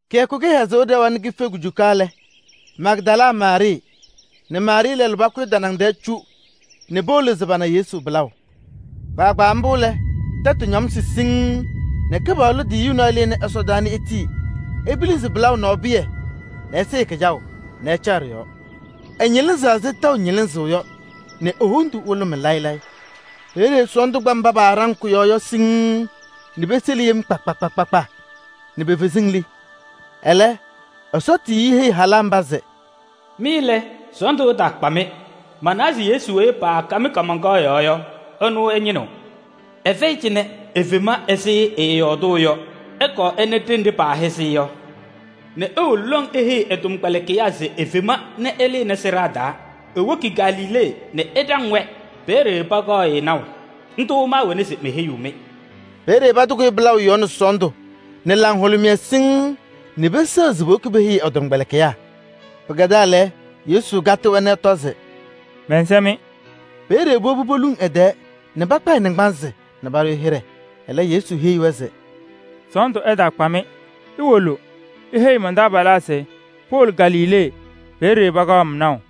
Kɩyakʋ kɩhɛzʋʋ ɖɛwa nɛ kife kujuka lɛ, Magdala Maarɩɩ nɛ Maarɩɩ lɛlʋ pakʋyɩ tanaŋ cu nɛ powolo se pana Yesu pɩlaʋ. Kpaagbaa mbʋ lɛ, tɛtʋ ñamsɩ siŋŋ nɛ Kɩpaɣlʋ tiyiyu nɔɔyʋ lɩnɩ ɛsɔdaa nɛ etii epilisi pɩlaʋ nɔɔ pɩyɛ nɛ ɛsɩɩ kɩjaʋ nɛ ɛcaɣ ɖɩ-yɔɔ. Ɛñɩlɩzaɣ ɛzɩ tɛʋ ñɩlɩzʋʋ yɔ nɛ e-wondu hʋlʋmɩ layɩ layɩ. Peeye sɔɔndʋ kpa mba paaɖaŋ kʋ-yɔɔ yɔ siŋŋ nɛ peseli yem kpa kpa kpa nɛ pe-feziŋ li. Ɛlɛ, Ɛsɔ tiyiyu heyi halaa mba se: “Mɩ lɛ, sɔɔndʋ ɛtaakpa-mɩ. Manawa se Yesu weyi paakam kaamaŋkaɣ yɔɔ yɔ, ɛnʋ ɩñɩnɩɣ. Ɛfɛyɩ cɩnɛ, efema ɛzɩ ɛɛyɔɔdʋʋ yɔ. Ɩkɔɔ ɩna ɖenɖe paahɛzɩ-ɩ yɔ nɛ iwolo lɔŋ iheyi ɛ-tɔmkpɛlɩkɩyaa se efema nɛ ɛlɩnɩ sɩɖaa taa. Ewoki Galilee nɛ ɛɖaŋ-wɛ, peeye pakaɣ-ɩ naʋ. Ndʋ maawɛna se meheyiɣ-mɩ.” Peeye patɩkʋyɩ pɩlaʋ yɔɔ nɛ sɔɔndʋ nɛ laŋhʋlʋmɩyɛ siŋŋ nɛ peseɣ se powoki peheyi ɛ-tɔmkpɛlɩkɩyaa. Pɩkɛdaa lɛ, Yesu katɩ-wɛ nɛ ɛtɔ se: “Mɛnsɛ-mɩ!” Peeye powobi poluŋ ɛ-tɛɛ nɛ pakpa ɛ-naŋgbanzɩ nɛ paɖʋ-ɩ hɩɖɛ. Ɛlɛ, Yesu heyi-wɛ se: “Sɔɔndʋ ɛtaakpa-mɩ. Iwolo iheyi man-taabalaa se powolo Galilee, peeye pakaɣ-m naʋ.”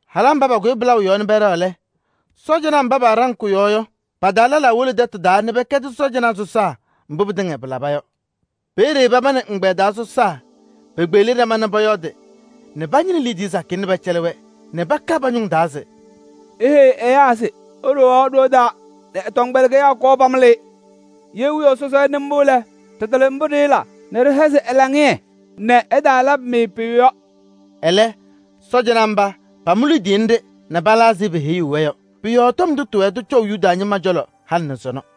Halaa mba pakʋyɩ pɩlaʋ yɔɔ nɛ pɛɖɛɣ lɛ, sɔɔjanaa mba paɖaŋ kʋ-yɔɔ yɔ, pa-taa lɛlaa wolo tɛtʋ taa nɛ pɛkɛdɩ cɔjɔnaa sɔsaa mbʋ pɩtɩŋa pɩlaba yɔ. Peeye paba nɛ ɛgbɛyɛ taa sɔsaa pekpeɣli ɖama nɛ pɔyɔɔdɩ nɛ pañɩnɩ liidiye sakɩyɛ nɛ pɛcɛlɩ-wɛ nɛ paka pa-ñʋŋ taa se: “Iheyi ɛyaa se iɖowaɣ ɖoo taa nɛ ɛ-tɔmkpɛlɩkɩyaa kɔɔ pamɩlɩ-ɩ. Ye wiyaʋ sɔsɔ ɛnɩ mbʋ lɛ, ɖɩtɩlɩ mbʋ ɖɩɩla nɛ ɖɩhɛzɩ ɛ-laŋɩyɛ nɛ ɛtaalabɩ-mɩ pʋyʋ yɔ.” Ɛlɛ sɔɔjanaa mba pamʋ liidiye nɖɩ nɛ pala ɛzɩ peheyuu-wɛ yɔ. Pʋ-yɔɔ tɔm ndʋ tɩwɛɛ tɩcɔʋ Yuda ñɩma cɔlɔ halɩ nɛ sɔnɔ.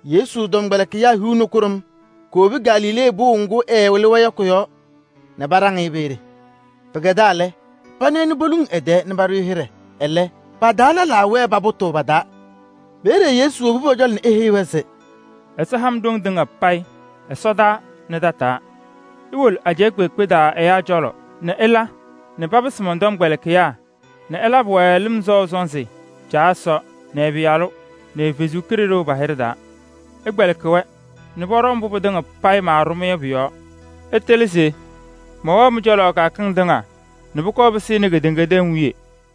Yesu tɔmkpɛlɩkɩyaa hiu nɛ kʋɖʋm kowobi Galilee pʋʋ ŋgʋ ɛɛwɩlɩ-wɛ yɔ kʋ-yɔɔ nɛ paɖaŋ-ɩ peeye. Pɩkɛdaa lɛ, pana-ɩ nɛ poluŋ ɛ-tɛɛ nɛ paɖʋ-ɩ hɩɖɛ. Ɛlɛ, pa-taa lɛlaa wɛɛ nɛ papʋtʋʋ pa-taa. Peeye Yesu wobi pɔ-cɔlɔ nɛ eheyi-wɛ se: “Ɛsɔ ha-m ɖoŋ tɩŋa payɩ ɛsɔdaa nɛ tataa. Iwolo ajɛɛ kpeekpe taa ɛyaa cɔlɔ nɛ ɩla nɛ papɩsɩ mɔn-tɔmkpɛlɩkɩyaa nɛ ɩlabɩ-wɛ lɩm sɔʋ sɔnzɩ Caa Ɛsɔ nɛ ɛ-Pɩyalʋ nɛ ɛ-Kalɩzaɣ pa-hɩɖɛ taa. Ɩkpɛlɩkɩ-wɛ nɛ pɔɖɔ mbʋ pɩtɩŋa payɩ maaɖʋ-mɩ yɔ pʋ-yɔɔ. Ɩtɩlɩ se mɛwɛɣ mɩ-cɔlɔ kɩyakɩŋ tɩŋa nɛ pʋkɔɔ pɩsɩnɩ kedeŋa tɛm wiye.”